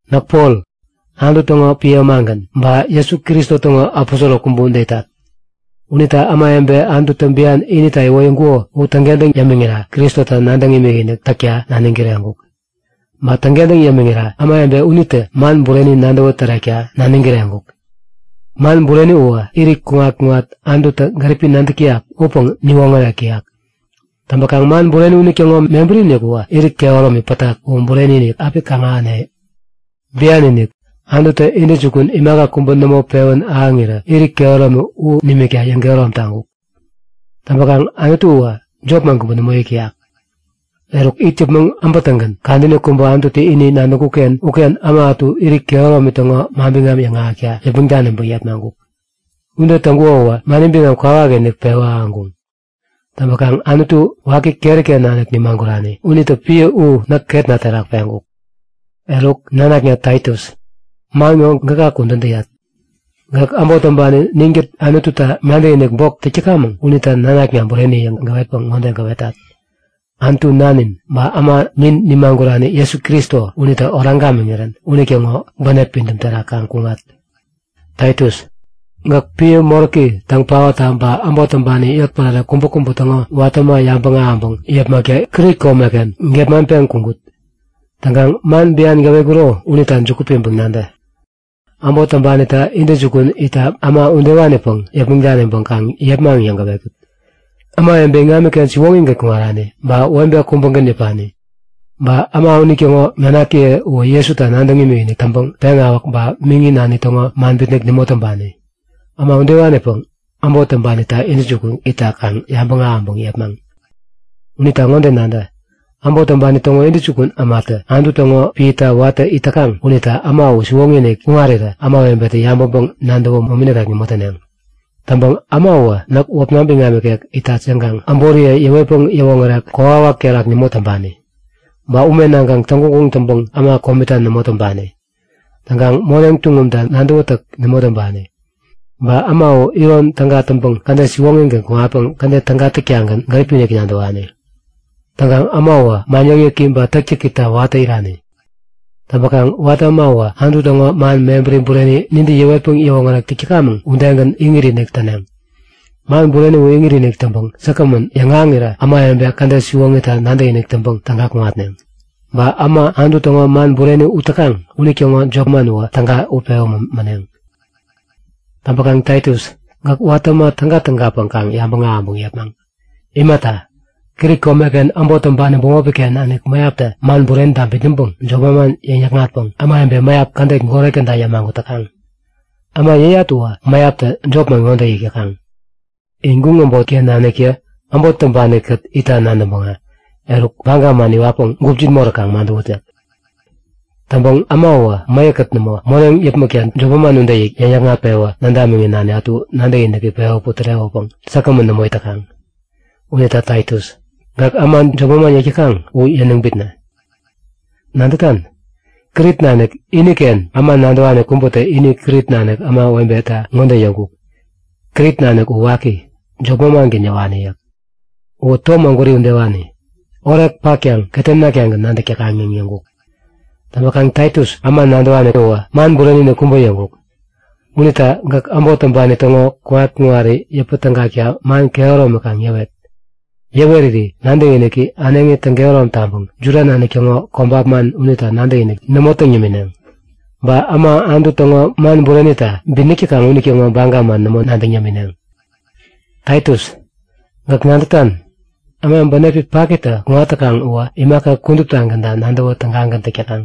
Näk Pol, Anutu täŋo piä ämagän ba Jesu Kristo täŋo aposoro kubä ude itat. Unita ämawebe Anututä bian inita iwoyäŋkuko u täŋkentäŋ yämiŋira Kristota nadäŋ imikinik täkta naniŋ kireŋkuk. Ba täŋkentäŋ yämiŋira ämawebe unitä man bureni nadäwä tärekta naniŋ kireŋkuk. Man bureni uwä irit kuŋat-kuŋat Anututä gäripi nadäk täyak upäŋ niwoŋärek täyak. Täŋpäkaŋ man bureni unitäŋo mebäri-inik uwä irit kehäromi pätak u bureni-inik api kaŋ-ahäne. Bian-inik, Anututä intäjukun imaka kubä nämo pewän ahäŋirä irit kehäromi u nimikta yäŋkehärom taŋkuk. Täŋpäkaŋ Anutu uwä jopman kubä nämo yäk täyak. Eruk it yäpmäŋ äbätäŋgän kadäni kubä Anututä ini nadäŋkuk-ken uken äma ätu irit kehäromi täŋo manbiŋam yäŋahäkta yäpmäŋ daniŋpäŋ yepmaŋkuk. Ude täŋkuko uwä mani biŋam kwawakinik pewä ahäŋkuŋ. Täŋpäkaŋ Anutu, waki keri-ken nanik nimagurani unitä piä u näk ketna terak peŋkuk. Eruk nanakna Taitus, man ŋo gäka kudän täyat. Gäk äbot täŋpani ninkät Anututa nadäkinik bok täk täkamäŋ unita nanakna bureni yäŋ gäwetpäŋ ŋode gäwetat; Anutu nanin ba äma nin nimagurani Jesu Kristo unitä oraŋ gamiŋirän unitäŋo bänep pidäm terak kaŋ kuŋat. Taitus, gäk piä moräki täŋ paotta ba äbot täŋpani yotpärare kubäkubä täŋo watä äma yabäŋ ahäŋpäŋ yepmakta Krit komeken gepmaŋpeŋ kuŋkut. Täŋkaŋ man bian gäwetkuro unita juku piŋpäŋ nadä; Äbot täŋpanita intäjukun itta äma ŋodewanipäŋ yäpmäŋ daniŋpäŋ kaŋ yepmaŋ yäŋ gäwetkut; Äma, ämawebe iŋamiken siwoŋigän kuŋarani, ba webe kubägän yäpani. Ba äma unitäŋo nanakiye uwä Jesuta nadäŋ imikinik täŋpäŋ peŋawäk ba miŋi nani täŋo man bitnäk nämo täŋpani. Äma udewanipäŋ, äbot täŋpanita intäjukun itta kaŋ yabäŋ ahäŋpäŋ yepmaŋ. Unita ŋode nadä; Äbot täŋpani täŋo intäjukun ämatä Anutu täŋo piäta watä it täkaŋ unita äma u siwoŋi-inik kuŋarirä ämawebetä yabäŋpäŋ-nadäwä momini nikek nämo täneŋ. Täŋpäŋ äma uwä näk wäpna biŋam ikek itat yäŋkaŋ äboriye yäwetpäŋ yäwoŋärek kokwawak terak nämo täŋpani. Ba ume naŋkaŋ täŋguŋguŋ täŋpäŋ äma komita nämo täŋpani. Täŋkaŋ moneŋ tuŋumta nadäwätäk nämo täŋpani. Ba äma u iron täga täŋpäŋ kädet siwoŋigän kuŋatpäŋ kädet täga-tagän gäripi-inik nadäwani. Täŋkaŋ äma uwä man yäkyäki ba täktäkita watä irani. Täŋpäkaŋ watä äma uwä Anutu täŋo man mebäri bureni nintä yäwetpäŋ yäwoŋärek täk täkamäŋ udegän iŋit-inik täneŋ. Man bureni u iŋit-inik täŋpäŋ säkgämän yäŋahäŋirä ämawebe kädet siwoŋita nadäkinik täŋpäŋ täga kuŋatneŋ, ba äma Anutu täŋo man bureni ut täkaŋ unitäŋo jopman uwä täga utpewä mäneŋ. Täŋpäkaŋ Taitus, gäk watä äma täga-tägapäŋ kaŋ yabäŋ ahäŋpäŋ yepmaŋ. Imata, Krit komeken äbot täŋpani bämopi-ken nanik mäyaptä man burenita bitnäŋpäŋ jop manman yäŋ-yäkŋatpäŋ ämawebe mäyap kädet goret käda yämagut täkaŋ. Äma yäyat uwä mäyaptä jopman ŋode yäk täkaŋ; In guŋ äbotken naniktä äbot täŋpani-kät itta nadäŋpäŋä, eruk baga man iwatkaŋ gupjin moräk kaŋ madäwut yäk. Täŋpäŋ äma uwä mäyäk-kät nämo moneŋ yäpmäkta jop manman ude yäŋ-yäkŋat-pewä nädamiŋi-nani ätu nadäkiniki pewä putärewäpäŋ säkgämän nämo it täkaŋ. Unita Taitus, gäk äma jop manman yäk täkaŋ u yäniŋ bitnä. Nadätan? Krit nanik iniken äma nadäwani kubätä ini Krit nanik ämawebeta ŋode yäŋkuk; Krit nanik u waki, jop manmangän yäwani yäk. Uwä tom ägwäri udewani, orek patkaŋ ketem naktagän nadäk täkaŋ yäŋ yäŋkuk. Täŋpäkaŋ Taitus, äma nadäwani uwä man bureni-inik kubä yäŋkuk. Unita gäk äbot täŋpani täŋo kuŋat-kuŋari yäpä tägakta man kehäromi kaŋ yäwet. Yäweriri nadäkiniki äneŋi täŋkehärom taŋpäŋ Juda nanik täŋo kobap man unita nadäkinik nämo täŋ yämineŋ. Ba äma Anutu täŋo man burenita bitnäk täkaŋ unitäŋo baga man nämo nadäŋ yämineŋ. Taitus, gäk nadätan? Äma bänepi paki-iniktä kuŋat täkaŋ uwä imaka kuduptagänta nadäwä tägagän täk täkaŋ.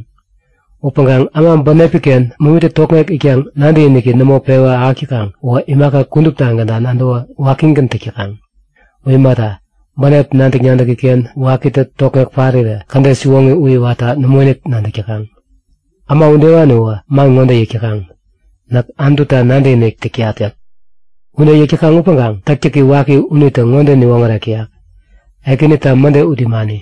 Upäŋkaŋ äma bänepi-ken momitä tokŋek itkaŋ nadäkinik nämo pewän ahäk täkaŋ uwä imaka kuduptagänta nadäwä wakigän täk täkaŋ. U imata, bänep nadäk-nadäki-ken wakitä tokŋek parirä kädet siwoŋi u iwatta nämoinik nadäk täkaŋ. Äma udewani uwä man ŋode yäk täkaŋ; Näk Anututa nadäkinik täk täyat yäk. Ude yäk täkaŋ upäŋkaŋ täktäki waki unitä ŋode niwoŋärek täyak; Ekänita mäde ut imani.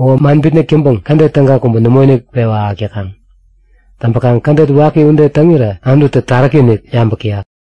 Uwä man bitnäk täŋpäŋ kädet täga kubä nämoinik pewä ahäk täkaŋ. Täŋpäkaŋ kädet waki ude täŋirä Anututä taräki-inik yabäk täyak.